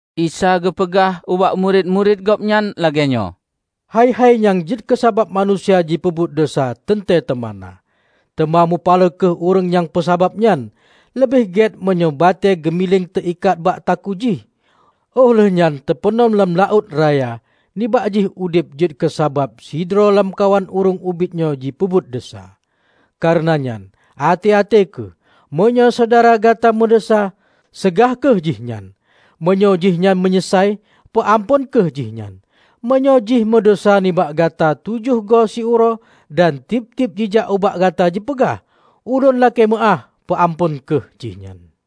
Isa geupeugah ubak murit-murit Gobnyan lagée nyoe, "Hai-hai nyang jeuet keusabab manusia jipeubuet desya teuntée teuma na. Teuma mupaloe kheueh ureuëng nyang peusabab nyan! Leubeh gét meunyoe batée geumiléng teuikat bak takue jih, óh lheuehnyan teupeunom lam laôt raya nibak jih udeb jeuet keusabab sidroe lamkawan ureuëng ubit nyoe jipeubuet desya. Kareuna nyan, até-até kheueh! Meunyoe syedara gata meudesya, seugah kheueh jihnyan. Meunyoe jih nyan meunyeusai, peuamphon kheueh jih nyan. Meunyoe jih meudesya nibak gata tujoh goe siuroe dan tieb-tieb jijak ubak gata jipeugah, 'Ulôn lakée meuáh,' peuamphon kheueh jihnyan."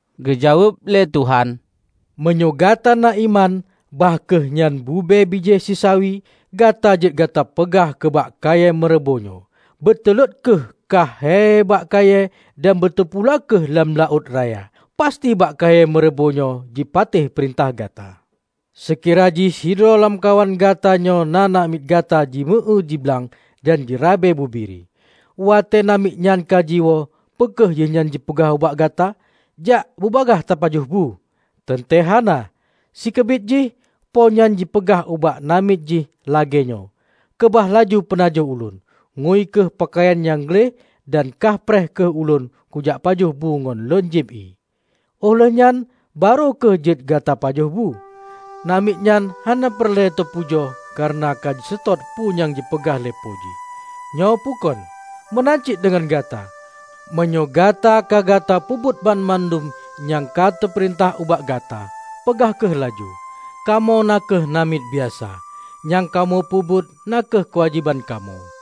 Geujaweueb lé Tuhan, "Meunyoe gata na iman bah kheueh nyan bube bijéh sisawi, gata jeuet gata peugah keubak kayée meureubo nyoe, 'Beuteulot kheueh kah hei bakkayée dan beuteupula kheueh lam laôt raya,' pasti bak kayée meureubo nyoe jipatéh peurintah gata." "Seukira jih sidroe lamkawan gata nyoe na namiet gata jimeu-éue diblang dan jirabe bubiri. Watée namiet nyan ka jiwoe, peu kheueh jihnyan jipeugah ubak gata, 'Jak bubagaih tapajoh bu?' Teuntée hana! Sikeubit jih Po nyan jipeugah ubak namiet jih lagée nyoe, 'Keubah laju peunajoh ulôn. Ngui kheueh peukayan nyang gleh dan kah preh kheueh ulôn kujak pajoh bu ngon lôn jieb ié; óh lheuehnyan barô kheueh jeuet gata pajoh bu.' Namiet nyan hana peureulée teupujoe kareuna ka jiseutôt peue nyang jipeugah lé Po jih, nyoe peukon? Meunan cit deungon gata. Meunyoe gata ka gata peubuet banmandum nyang ka teupeurintah ubak gata, peugah kheueh laju, 'Kamoe na kheueh namiet biasa; nyang kamoe peubuet na kheueh keuwajéban kamoe.' "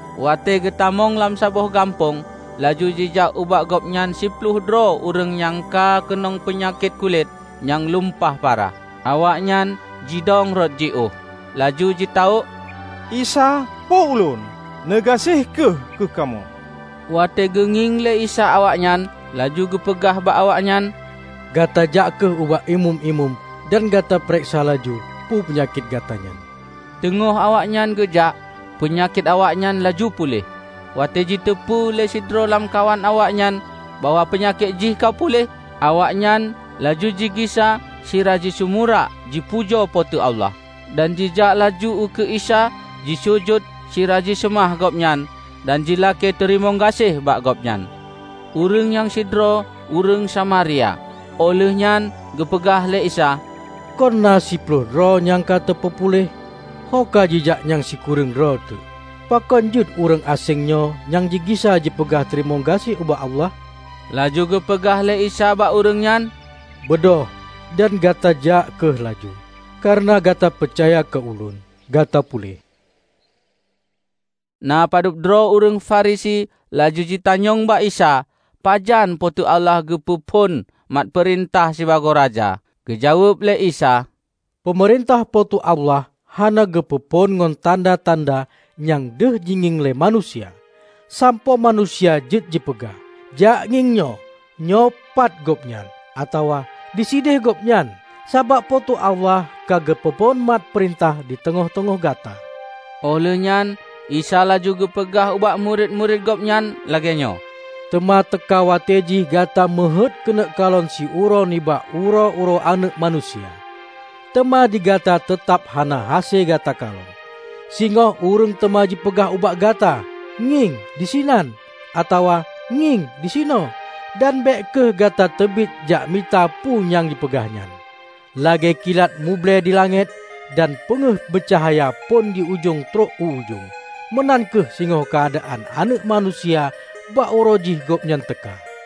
Watée geutamong lam saboh gampông, laju jijak ubak gobnyan siploh droe ureuëng nyang ka keunong peunyakét kulét nyang lumpah parah. Awaknyan jidong rot jiôh laju jitawök, "Isa, Po ulôn! Neugaséh kheueh keukamoe!" Watée geungieng lé Isa awaknyan, laju geupeugah bak awaknyan, "Gata jak kheueh ubak Imeum-imeum dan gata peureksa laju peue peunyakét gata nyan." Teungoh awaknyan geujak, peunyakét awaknyan laju puléh. Watée jiteupeu lé sidroe lamkawan awaknyan bahwa peunyakét jih ka puléh, awaknyan laju jigisa sira jisumurak jipujoe Po teu Allah. Dan jijak laju ukeue Isa jisujut sira jiseumah Gobnyan dan jilakée teurimong gaséh bak Gobnyan. Ureuëng nyan sidroe ureuëng Samaria. Óh lheueh nyan geupeugah lé Isa, "Kon na siploh droe nyang ka teupeupuléh? Ho kajijak nyang sikureueng droe teuk? Pakon jeuet ureuëng aséng nyoe nyang jigisa jipeugah teurimong gaséh ubak Allah?" Laju geupeugah lé Isa bak ureuëng nyan, "Beudôh dan gata jak kheueh laju. Kareuna gata peucaya keu Ulôn, gata puléh." Na padub droe ureuëng Farisi laju jitanyong bak Isa pajan Po teu Allah geupeu phon mat peurintah sibagoe Raja. Geujaweueb lé Isa, "Peumeurintah Po teu Allah hana geupeu phon ngon tanda-tanda nyang deuh jingieng lé manusia, sampoe manusia jeuet jipeugah, 'Jakngieng nyoe, nyoe pat gobnyan!' atawa, 'Disideh gobnyan!' Sabab Po teu Allah ka geupeu phon mat peurintah diteungoh-teungoh gata." Óh lheueh nyan Isa laju geupeugah ubak murit-murit Gobnyan lagée nyoe, "Teuma teuka watée jih gata meuheuét keuneuk kalon siuroe nibak uroe-uroe Aneuëk Manusia, teuma digata teutab hana hase gata kalon. Singoh ureuëng teuma jipeugah ubak gata, 'Ngieng, disinan!' atawa, 'Ngieng, disinoe!' Dan bék kheueh gata teubiet jak mita peue nyang jipeugah nyan. Lagée kilat muble dilangét, dan peungéh meucahya phon di ujong trok u ujong, meunan kheueh singoh keuadaan Aneuëk Manusia bak uroe jih gobnyan teuka.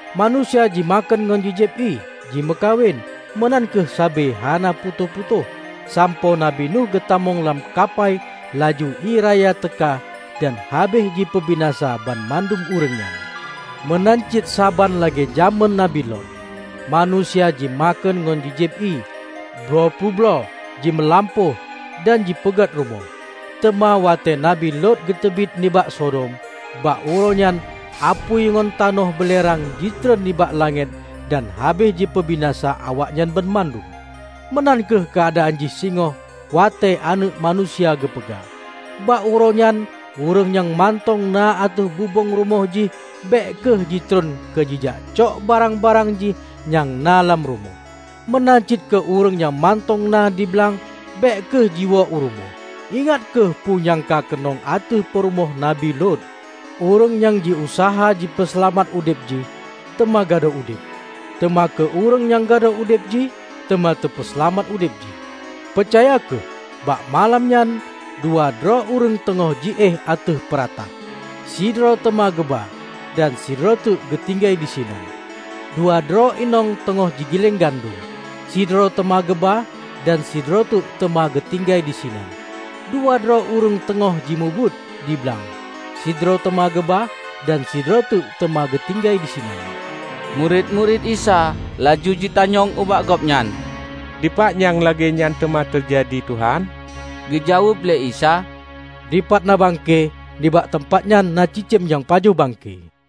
Manusia jimakheun ngon jijieb ié, jimeukawen; meunan kheueh sabe hana putôh-putôh sampoe Nabi Nuh geutamong lam kapai laju ié raya teuka dan habéh jipeubinasa banmandum ureuëng nyan. Meunan cit saban lagée jamén Nabi Lot. Manusia jimakheun ngon jijieb ié, bloe peubloe, jimeulampôh dan jipeugét rumoh. Teuma watée Nabi Lot geuteubiet nibak Sodom, bak uroe nyan apui ngon tanoh beulerang jitreun nibak langét dan habéh jipeubinasa awaknyan banmandum. Meunan kheueh keuadaan jih singoh watée Aneuëk Manusia geupeugah. Bak uroe nyan ureuëng nyang mantong na ateueh bubông rumoh jih bék kheueh jitreun keu jijak cok barang-barang jih nyang na lam rumoh. Meunan cit keu ureuëng nyang mantong na di blang bék kheueh jiwoe u rumoh. Ingat kheueh peue nyang ka keunong ateueh peurumoh Nabi Lot! Ureuëng nyang jiuseuha jipeuseulamat udeb jih, teuma gadôh udeb. Teuma keu ureuëng nyang gadôh udeb jih teuma teupeuseulamat udeb jih. Peucaya kheueh: Bak malam nyan, dua droe ureuëng teungoh jiéh ateueh peuratah, sidroe teuma geuba dan sidroe teuk geutinggai disinan. Dua droe inong teungoh jigileng gandom, sidroe teuba geuba dan sidroe teuk teuma geutinggai disinan. Dua droe ureuëng teungoh jimubuet diblang, sidroe teuma geuba dan sidroe teuk teuma geutinggai disinan." Murit-murit Isa laju jitanyong ubak Gobnyan, "Dipat nyang lagée nyan teuma teujadi, Tuhan?" Geujaweueb lé Isa, "Dipat na bangke, nibak teumpat nyan na cicém nyang pajoh bangke."